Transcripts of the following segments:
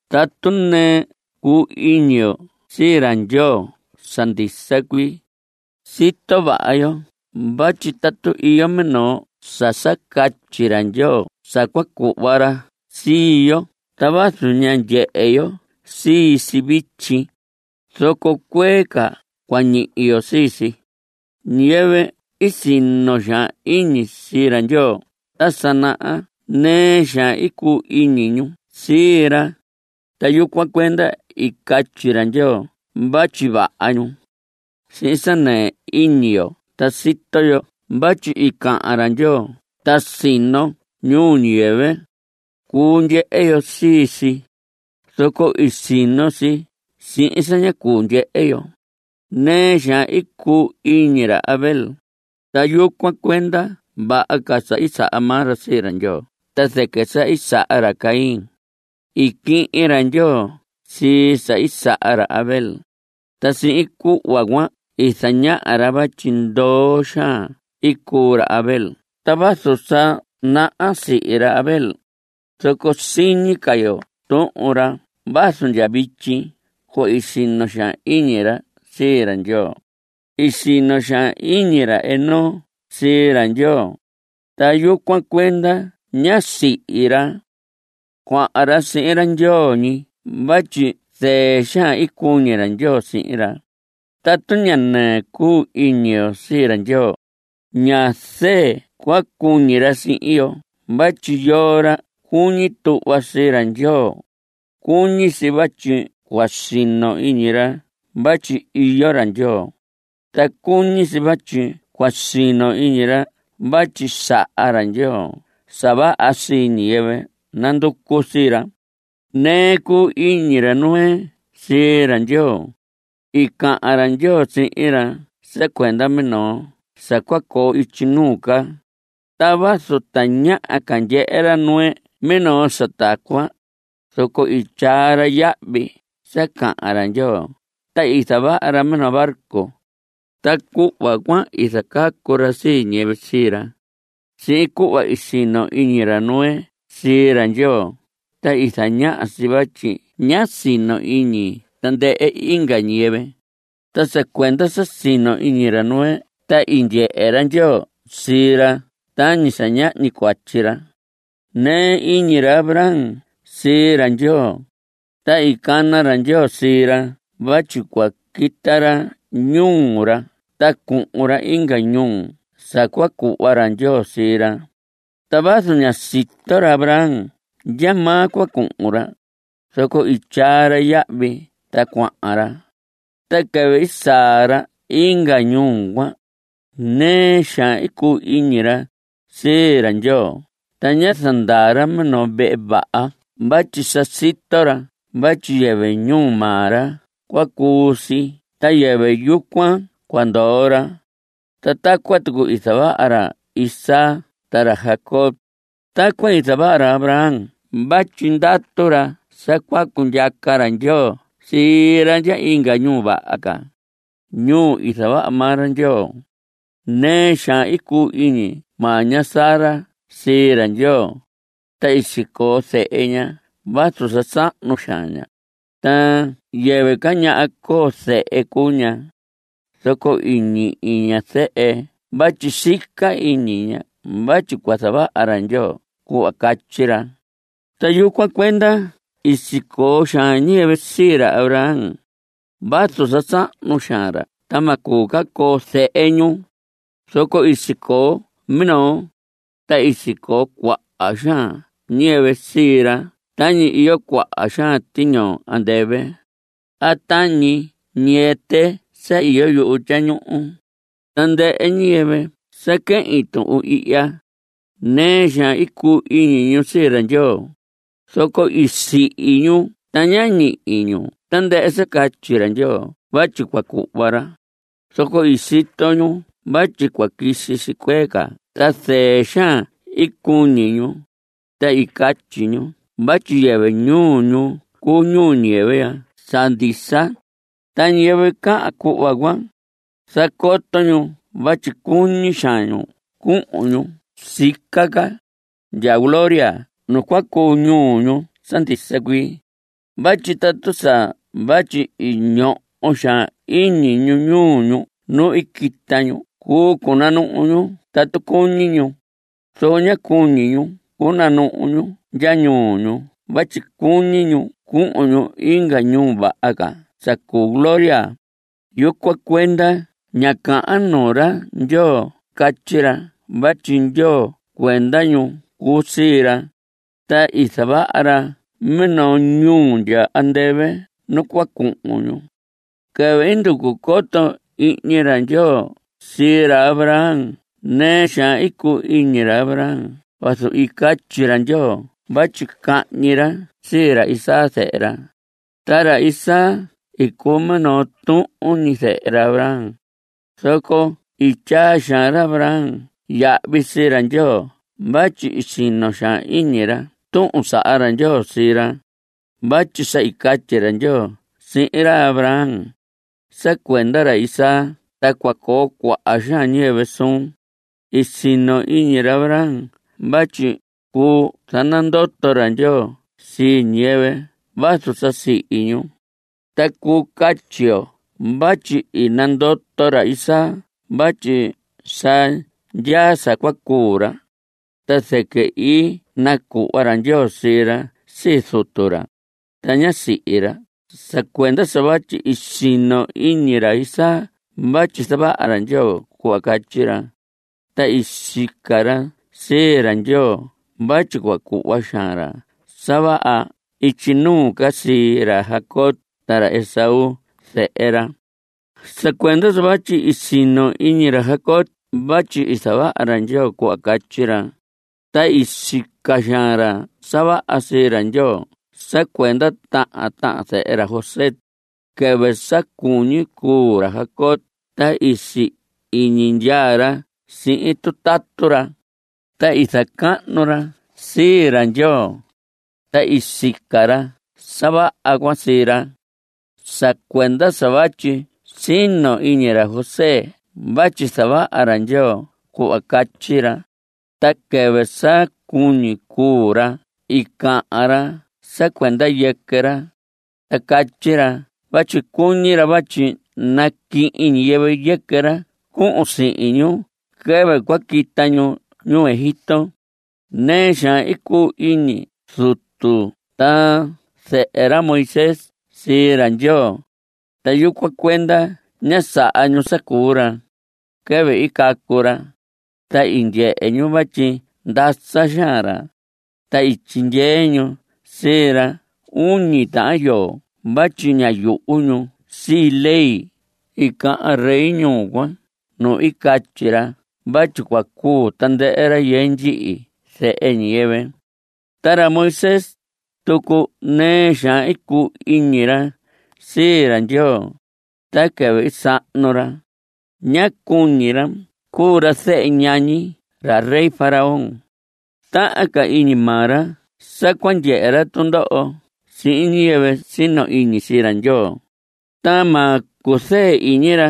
Tatu nɨɨ cuu iñi yo sii ra Ndyoo sa ndisa cuii, sito vaha yo vatyi tatu iyo minoo sa sa catyi ra Ndyoo sa cua cuhva ra sii yo ta vazu ña ndyehe yo sii si vityi, zoco cuee ca cua ñihi yo sii si. Ñiyɨvɨ i sino xaan iñi sii ra Ndyoo ta sa naha nɨɨ xaan i cuu iñi ñu sii ra, ta yucuan cuenda i catyi ra Ndyoo vatyi vaha ñu. Sihin sa nɨɨ iñi yo ta sito yo vatyi i cahan ra Ndyoo ta i sino ñuu ñiyɨvɨ. Cuu ndyehe yo sii si, zoco i sino si sihin sa ña cuu ndyehe yo. Nɨɨ xaan i cuu iñi ra Abel, ta yucuan cuenda vaha ca sa i saha maa ra sii ra Ndyoo ta zɨquɨ sa i saha ra Caín. I quihin ra Ndyoo sii sa i saha ra Abel, ta sihin cuhva cuan i zañaha ra vatyi ndoo xaan i cuu ra Abel. Ta vazu sa naha sihi ra Abel, zoco siñi ca yo tuhun ra vazu ndya vityi cuhva i sino xaan iñi ra sii ra Ndyoo. I sino xaan iñi ra Enoc sii ra Ndyoo, ta yucuan cuenda ñá sihi ra. Cuahan ra sihin ra Ndyoo ñi vatyi zɨɨ xaan i cuñi ra Ndyoo sihin ra. Tatu ña nɨɨ cuu iñi yo sii ra Ndyoo, ña zɨɨ cua cuñi ra sihin yo vatyi yoo ra cuñi tuhva sii ra Ndyoo, cuñi si vatyi cua sino iñi ra vatyi iyo ra Ndyoo, ta cuñi si vatyi cua sino iñi ra vatyi saha ra Ndyoo sa vaha sii ñiyɨvɨ nanducu sii ra. Nɨɨ i cuu iñi ra Noé sii ra Ndyoo. I cahan ra Ndyoo sihin ra sa cuenda minoo sa cua coo ityi nuu ca, ta vazu tañaha ca ndyehe ra Noé minoo sa tacuan, zoco i tyaa ra yahvi sa cahan ra Ndyoo ta i zavaha ra minoo barco, ta cuhva cuan i zacacu ra sii ñiyɨvɨ sii ra. Sihin cuhva i sino iñi ra Noé sii ra Ndyoo ta i zañaha si vatyi ñá sino iñi tandɨhɨ inga ñiyɨvɨ. Ta sa cuenda sa sino iñi ra Noé ta i ndyehe ra Ndyoo sii ra tañi sa ñahñi cuatyi ra. Nɨɨ iñi ra Abraham sii ra Ndyoo, ta i cana ra Ndyoo sii ra vatyi cua quita ra ñuu ra ta cuhun ra inga ñuu sa cua cuhva ra Ndyoo sii ra. Ta vazu ñá sito ra Abraham ndyamaa cua cuhun ra, zoco i tyaa ra yahvi ta cuahan ra. Ta quɨvɨ i saa ra inga ñuu cuan, nɨɨ xaan i cuu iñi ra sii ra Ndyoo ta ñá zandaa ra minoo vehe vaha vatyi sa sito ra vatyi yɨvɨ ñuu maa ra cua cuu si ta yɨvɨ yucuan cua ndoo ra. Ta tacuan tucu i zavaha ra Isaac ta ra Jacob. Tacuan i zavaha ra Abraham vatyi ndatu ra sa cua cundyaca ra Ndyoo sii ra ndya inga ñuu vaha ca, ñuu i zavaha maa ra Ndyoo. Nɨɨ xaan cuu iñi maa ña Sara sii ra Ndyoo, ta i sicoo zehe ña vazu sa sahnu xaan ña, ta yɨvɨ ca ñaha coo zehe cuu ña. Zoco i ñihi ña zehe vatyi sica iñi ña vatyi cua zavaha ra Ndyoo cuhva catyi ra. Ta yucuan cuenda i sicoo xaan ñiyɨvɨ sii ra Abraham. Vazu sa sahnu xaan ra ta ma cuu ca coo zehe ñu, zoco i sicoo minoo, ta i sicoo cuaha xaan ñiyɨvɨ sii ra tañi iyo cuaha xaan tiñoo andɨvɨ a tañi ñiyɨtɨ sa iyo yuhu tyañuhu. Tandɨhɨ ñiyɨvɨ sa quehin tuhun ihya, nɨɨ xaan i cuu iñi ñu sii ra Ndyoo, zoco i sihi ñu ta ñá ñihi ñu tandɨhɨ sa catyi ra Ndyoo vatyi cua cuhva ra, zoco i sito ñu vatyi cua quisi si cuee ca ta zɨɨ xaan i cuñi ñu, ta i catyi ñu vatyi yɨvɨ ñuu ñu cuu ñuu ñiyɨvɨ ya sa ndisa. Ta ñiyɨvɨ cahan cuhva cuan, zacoto ñu vatyi cuñi xaan ñu cuhun ñu sica ca (ndya gloria nu cu ñuu ñu sa ndisa cuii). Vatyi tatu sa vatyi i ñoho xaan iñi ñu ñuu ñu nu i quita ñu, cuu cunanuhu ñu tatu cuñi ñu. Zoco ñá cuñi ñu cunuhu ñu ndya ñuu ñu vatyi cuñi ñu cuhun ñu inga ñuu vaha ca sa cuu gloria. Yucuan cuenda ña cahan nuu ra Ndyoo catyi ra vatyi Ndyoo cuenda ñu cuu sii ra, ta i zavaha ra minoo ñuu ndya andɨvɨ nu cua cuhun ñu. Quɨvɨ i nducu coto ihñi ra Ndyoo sii ra Abraham nɨɨ xaan i cuu iñi ra Abraham vazu i catyi ra Ndyoo vatyi cahñi ra sii ra Isaac zehe ra. Ta ra Isaac i cuu minoo tuhun ñi zehe ra Abraham. Zoco i tyaa xaan ra Abraham yahvi sii ra Ndyoo vatyi i sino xaan iñi ra tuhun i saha ra Ndyoo sii ra. Vatyi sa i catyi ra Ndyoo sihin ra Abraham: “Sa cuenda ra Isaac ta cua coo cuaha xaan ñiyɨvɨ suun.” I sino iñi ra Abraham vatyi cuu zanandoto ra Ndyoo sii ñiyɨvɨ vazu sa sihi ñu. Ta cuu catyi yo vatyi i nandoto ra Isaac vatyi sa ndyaa sa cua cuu ra, ta zɨquɨ i nacuhva ra Ndyoo sii ra sii zutu ra, ta ñá sihi ra. Sa cuenda sa vatyi i sino iñi ra Isaac vatyi zavaha ra Ndyoo cuhva catyi ra, ta i sica ra sii ra Ndyoo vatyi cua cuhva xaan ra sa vaha ityi nuu ca sii ra Jacob ta ra Esaú zehe ra. Sa cuenda sa vatyi i sino iñi ra Jacob vatyi zavaha ra Ndyoo cuhva catyi ra, ta i sica xaan ra sa vaha sii ra Ndyoo sa cuenda tahan tahan zehe ra José. Quɨvɨ sa cuñi cuu ra Jacob ta si‑iñi ndyaa ra sihin tutatu ra, ta i zacahnu ra sii ra Ndyoo, ta i sica ra sa vaha cuan sii ra. Sa cuenda sa vatyi i sino iñi ra José vatyi zavaha ra Ndyoo cuhva catyi ra, ta quɨvɨ sa cuñi cuu ra i cahan ra sa cuenda yɨquɨ ra. Ta catyi ra vatyi cuñi ra vatyi naquihin ñiyɨvɨ yɨquɨ ra cuhun sihin ñu quɨvɨ cua quita ñu ñuu Egipto. Nɨɨ xaan i cuu iñi zutu ta zɨhɨ ra Moisés sii ra Ndyoo, ta yucuan cuenda ñá saha ñu sa cuu ra. Quɨvɨ i cacu ra ta i ndyehe ñu vatyi ndasa xaan ra, ta i tyixehe ñu sii ra uñi tahan yoo vatyi ñá yuhu ñu sii ley i cahan rey ñuu cuan nu i catyi ra vatyi cua cuu tandɨhɨ rayɨɨ ndyihi zehe ñiyɨvɨ. Ta ra Moisés tucu nɨɨ xaan i cuu iñi ra sii ra Ndyoo, ta quɨvɨ i sahnu ra, ñá cuñi ra cuu ra zehe ñañi ra rey Faraón. Tahan ca iñi maa ra sa cua ndyehe ra tundoho sihin ñiyɨvɨ sino iñi sii ra Ndyoo, ta ma cuzɨɨ iñi ra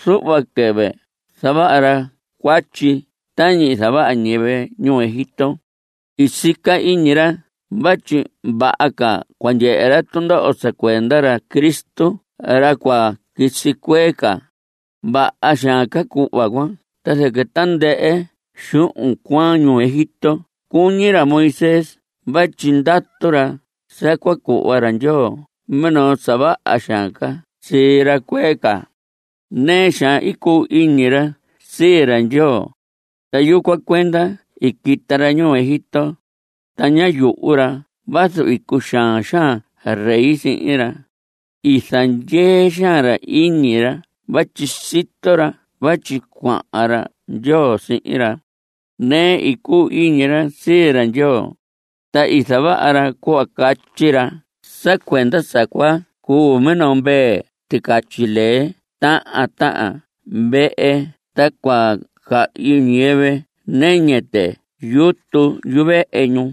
zuhva quɨvɨ zavaha ra cuatyi tañi zavaha ñiyɨvɨ ñuu Egipto. I sica iñi ra vatyi vaha ca cua ndyehe ra tundoho sa cuenda ra Cristo, ra cua quisi cuee ca. Vaha xaan ca cuhva cuan ta zɨquɨ tandɨhɨ xuhun cuaan ñuu Egipto cuñi ra Moisés vatyi ndatu ra sa cua cuhva ra Ndyoo minoo sa vaha xaan ca sii ra cuee ca. Nɨɨ xaan i cuu iñi ra sii ra Ndyoo, ta yucuan cuenda i quita ra ñuu Egipto, ta ñá yuhu ra vazu i cuxaan xaan ra rey sihin ra. I zandyee xaan ra iñi ra vatyi sito ra vatyi cuahan ra Ndyoo sihin ra. Nɨɨ i cuu iñi ra sii ra Ndyoo, ta i zavaha ra cuhva catyi ra sa cuenda sa cua cuu minoo mvee ticatyi lee tahan tahan vehe ta cua cahyi ñiyɨvɨ nɨñɨ tɨ yutu yuvehe ñu.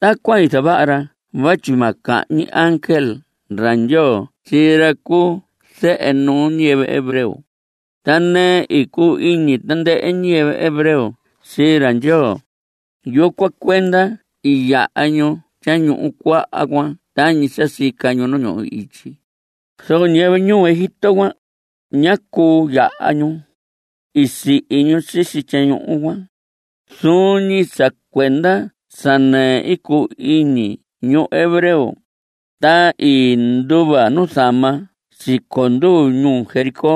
Tacuan i zavaha ra vatyi ma cahñi ángel ra Ndyoo sii ra cu zehe nuu ñiyɨvɨ hebreo. Ta nɨɨ i cuu iñi tandɨhɨ ñiyɨvɨ hebreo sii ra Ndyoo. Yucuan cuenda i yaha ñu Tyañuhu Cuaha cuan tañi sa sica ñu nu ñuhu ityi. Zoco ñiyɨvɨ ñuu Egipto cuan, ñá cuu yaha ñu. I sihi ñu sisi tyañuhu cuan. Zuun ñi sa cuenda sa nɨɨ cuu iñi ñu hebreo, ta i nduva nuzama siconduu ñuu Jericó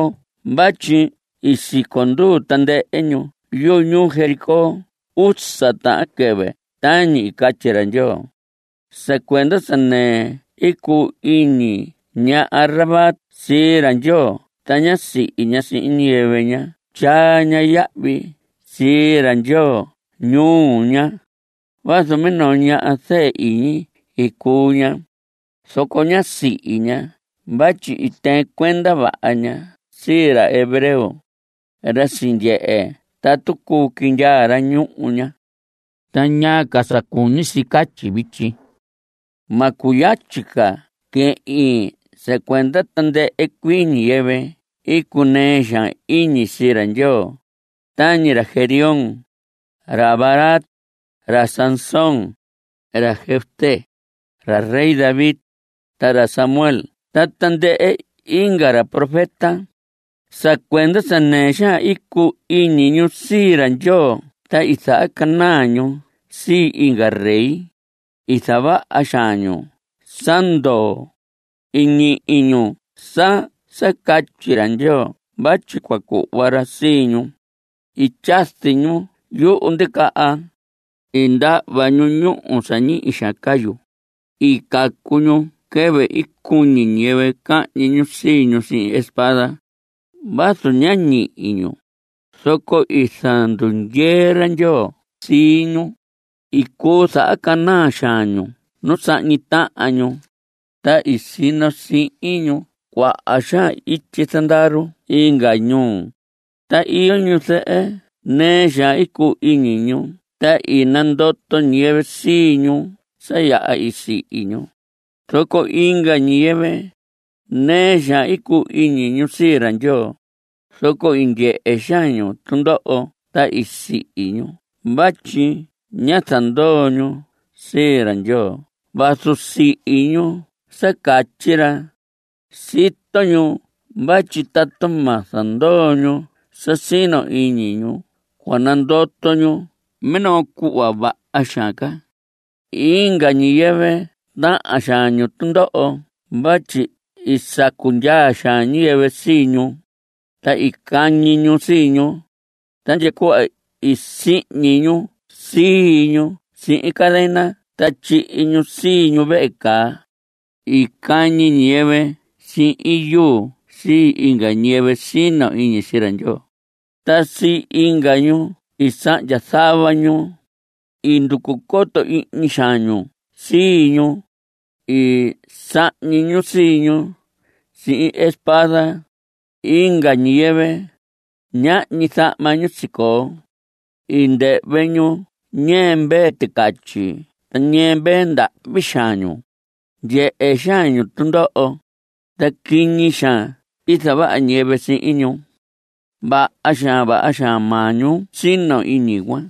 vatyi i siconduu tandɨhɨ ñu yuñuu Jericó usa tahan quɨvɨ tañi i catyi ra Ndyoo. Sa cuenda sa nɨɨ cuu iñi ña Rahab sii ra Ndyoo ta ñá sihi ña sihin ñiyɨvɨ ñá tyaa yahvi sii ra Ndyoo ñuu ña. Vazu minoo ñaha zɨɨ iñi i cuu ña, zoco ñá sihi ña vatyi i tɨɨn cuenda vaha ña sii ra hebreo, ra i sindyehe tatu cuu quindyaa ra ñuu ña. ¿Ta ñaa ca sa cuñi si sa catyi vityi? Ma cuyatyi ca quehin sa cuenda tandɨhɨ cuii ñiyɨvɨ i cunɨɨ xaan iñi sii ra Ndyoo, tañi ra Gedeón, ra Barac, ra Sansón, ra Jefté, ra rey David, ra Samuel ta tandɨhɨ inga ra profeta. Sa cuenda sa nɨɨ xaan cuu iñi ñu sii ra Ndyoo ta i zahacanaa ñu sii inga rey. I zavaha xaan ñu sa ndoo. I ñihi ñu sa sa catyi ra Ndyoo vatyi cua cuhva ra sii ñu. I tyazi ñu yuhu ndicaha. I ndahva ñu ñúhu sa ñihi xaan cayu. I cacu ñu quɨvɨ i cuñi ñiyɨvɨ cahñi ñu sii ñu sihin espada. Vazu ña ñihi ñu, zoco i zandundyee ra Ndyoo sii ñu. I cuu zahacanaa xaan ñu nu sahñi tahan ñu, ta i sino sihin ñu cuaha xaan ityi zandaru inga ñuu. Ta iyo ñuzɨhɨ nɨɨ xaan i cuu iñi ñu ta i nandoto ñiyɨvɨ sii ñu sa yaha i sihi ñu. Zoco inga ñiyɨvɨ, nɨɨ xaan i cuu iñi ñu sii ra Ndyoo, zoco i ndyehe xaan ñu tundoho ta i sihi ñu vatyi ñá zandoo ñu sii ra Ndyoo vazu sihi ñu sa catyi ra. Sito ñu vatyi tatu ma zandoo ñu sa sino iñi ñu cua nandoto ñu minoo cuhva vaha xaan ca. Inga ñiyɨvɨ tahan xaan ñu tundoho vatyi sacu ndyaa xaan ñiyɨvɨ sii ñu, ta i cañi ñu sii ñu, ta cuhva ndya sihñi ñu sii ñu sihin cadena ta tyihi ñu sii ñu vehe caa. I cañi ñiyɨvɨ sihin yuu sii inga ñiyɨvɨ sino iñi sii ra Ndyoo, ta sii inga ñu i sahndya zava ñu. I nducu coto ihñi xaan ñu sii ñu. I sahñi ñu sii ñu sihin espada. Inga ñiyɨvɨ, ñahñi zahma ñu sicoo. I ndɨhvɨ ñu ñɨɨ mvee ticatyi ta ñɨɨ mvee. Ndahvi xaan ñu. Ndyehe xaan ñu tundoho. Ta quiñi xaan i zavaha ñiyɨvɨ sihin ñu. Vaha xaan vaha xaan maa ñu sino iñi cuan,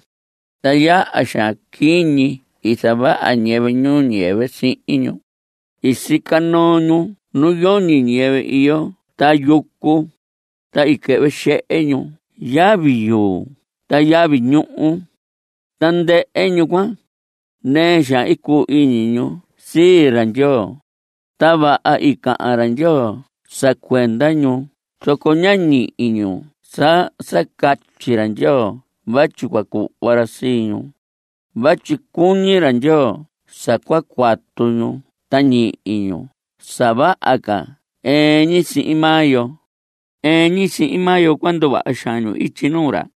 ta yaha xaan quiñi i zavaha ñiyɨvɨ ñuu ñiyɨvɨ sihin ñu. I sica noo ñu nu yoñi ñiyɨvɨ iyo ta yucu. Ta i quɨhvɨ xehe ñu yavi yuu ta yavi ñuhu. Tandɨhɨ ñu cuan, nɨɨ xaan i cuu iñi ñu sii ra Ndyoo, ta vaha i cahan ra Ndyoo sa cuenda ñu, zoco ñá ñihi ñu sa sa catyi ra Ndyoo vatyi cua cuhva ra sii ñu. Vatyi cuñi ra Ndyoo sa cua cuatu ñu ta ñihi ñu sa vaha ca ɨɨn ñi sihin maa yo. Ɨɨn ñi sihin maa yo cua nduvaha xaan ñu ityi nuu ra.